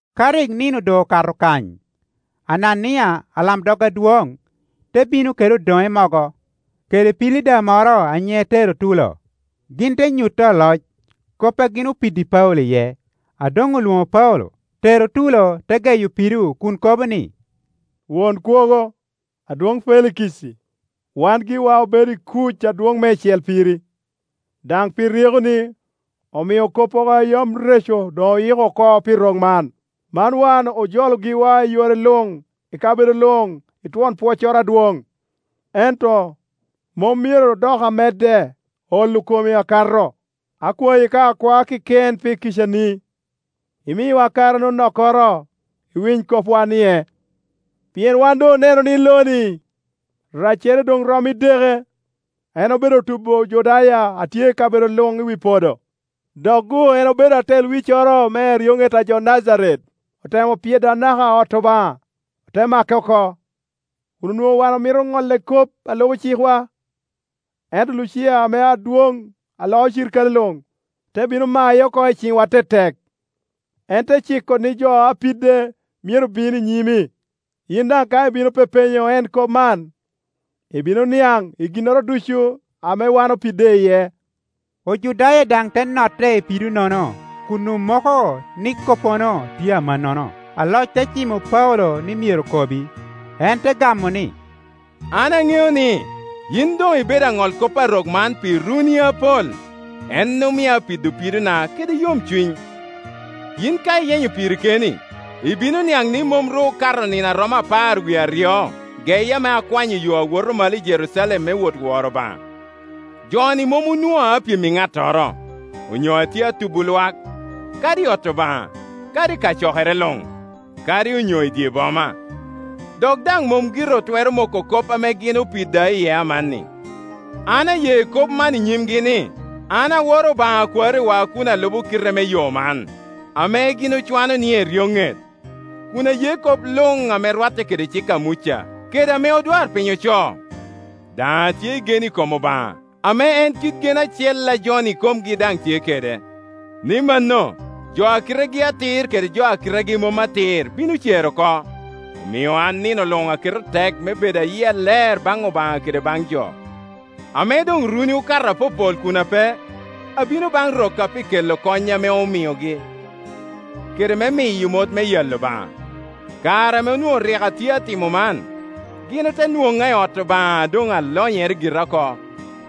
Ka rik nino doŋ okato kany, Anania, alamdog adwoŋ, te bino kede odoŋe mogo, kede pilida moro a nyiŋe Terutulo. Gin te nyutti aloc kop a gin opiddi Paulo iye. A doŋ olwoŋo Paulo, Terutulo te geyo pido kun kobo ni, “Won Kwogo, adwoŋ Felikici, wan giwa obedo i kuc adwoŋ meicel piri, daŋ pi ryekoni, omio koppogo a yam reco doŋ oyiko oko pi rok man. Man wan ojolo giwa i yore luŋ i kabedo luŋ i twon pwoccoro adwoŋ. Ento, mom myero dok amedde olo komi akato. Akwayi ka akwaa keken pi kicani, imiwa kare anonokkoro, iwiny kopwa-nie. Pien wan doŋ oneno ni lo-ni, raccere doŋ rom i edeke. En obedo tubo Ojudaya a tye i kabedo luŋ i wi podo; dok-gu en obedo atel wiccoro me eryoŋet a jo Najaret. Otemo pyedo anaka ot Obaŋa, ote make oko, [kun onwoŋo wan omito ŋolle kop a lubo ci kwa. Ento Lucia ame adwoŋ a loo cirikale luŋ, te bino maye oko i ciŋwa tetek. En te ciko ni jo a pide myero bin i nyimi.] Yin daŋ ka ibino pepenyo en kop man, ibino niaŋ i ginnoro ducu ame wan opide iye.” Ojudaya daŋ te notte i pido-nono kun omoko ni koppono tye amannono. Aloc te cimo Paulo ni myero kobi, en te gamo ni, “An aŋeo ni, yin doŋ ibedo aŋolkop a rok man pi runi apol, en omio apido pidona kede yomcuny. Yin ka iyenyo piri keni, ibino niaŋ ni mom ru okato nino a romo apar wie aryo geye ame akwanyo yo awoto malo i Jerucalem me wot woro Obaŋa. Jo-ni mom onwoŋa apyem i ŋattoro, onyo atye atubo lwak, kadi i ot Obaŋa, kadi i kacokere luŋ, kadi onyo i dye boma. Dok daŋ mom gire otwero moko kop ame gin opida iye amanni. An aye kop man i nyimgi ni, an aworo Obaŋa a kwariwa kun alubo kite me Yo man, ame gin ocwano ni eryoŋet, kun aye kop luŋ ame rwatte kede cik a Muca, kede ame odwarpiny ocoo. Daŋ atyei gen i kom Obaŋa, ame en kit gen acel a jo-ni ikomgi daŋ tye kede, ni mano, jo a kitegi atir kede jo a kitegi mom atir bino cer oko. Omio an nino luŋ aketo tek me bedo a yia ler baŋ Obaŋa kede baŋ jo. Ame doŋ runi okato apopol kun ape, abino baŋ rokka pi kelo kony ame omiogi, kede me miyo mot me yalo Obaŋa. Kare ame onwoŋo rik atye atimo man, gin ote nwoŋa i ot Obaŋa a doŋ alonyere gira oko,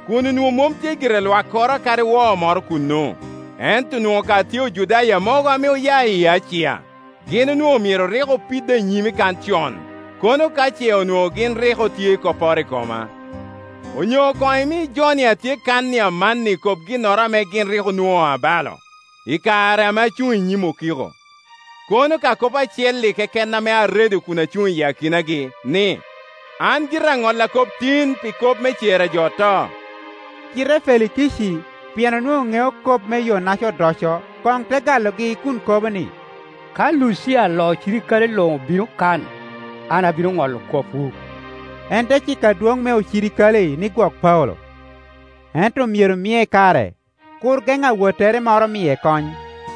kun onwoŋo mom tye gire lwakkoro kadi woo moro kuno. Ento onwoŋo ka tye Ojudaya mogo ame oya i Acia; gin onwoŋo myero rik opida i nyimi kan con, kono ka ce onwoŋo gin rik otye i kopporo i koma. Onyo koŋ imi jo-ni a tye kan amanni kob ginnoro ame gin rik onwoŋa abalo, i kare ame acuŋ i nyim okiko. Kono ka kop acel-li keken ame aredo kun acuŋ i akinagi, ni, ‘An gira aŋolla kop tin pi kop me cer a jo oto.’” Cite Felikici, pien onwoŋo ŋeo kop me Yo-naca odoco, koŋ te galogi kun kobo ni, “Ka Lucia alo cirikale luŋ obino kan, an abino ŋolo kopwu.” En te ciko adwoŋ me ocirikale ni gwok Paulo, ento myero mie kare, kur geŋ awottere moro miye kony.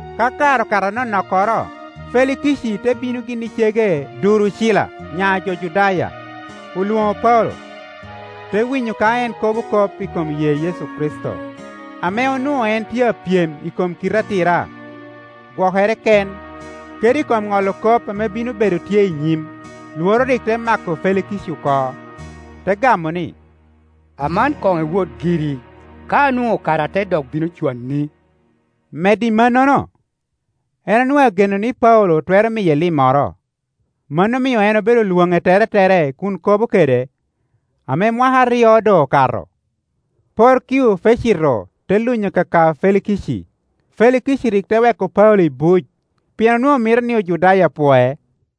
Ka kare okato anonokkoro, Felikici te bino gin i cege Durucila, nya jo Judaya. Olwoŋo Paulo, te winyo ka en kobo kop i kom ye Yecu Kricito. Ame onwoŋo en tye apyem i kom kite atira, gwokere ken, kede i kom ŋolo kop ame bino bedo tye i nyim, lworo rik te mako Felikici oko, te gamo ni, “Aman koŋ iwot giri; ka anwoŋo kare ate dok bino cwani.” Medo i mannono, en onwoŋo ageno ni Paulo twero miye limmoro. Mano omio en obedo lwoŋe teretere kun kobo kede. Ame mwaka aryo doŋ okato, Porkio Fesito te lunyo kaka Felikici. Felikici rik te weko Paulo i buc, pien onwoŋo mito ni Ojudaya pwoe.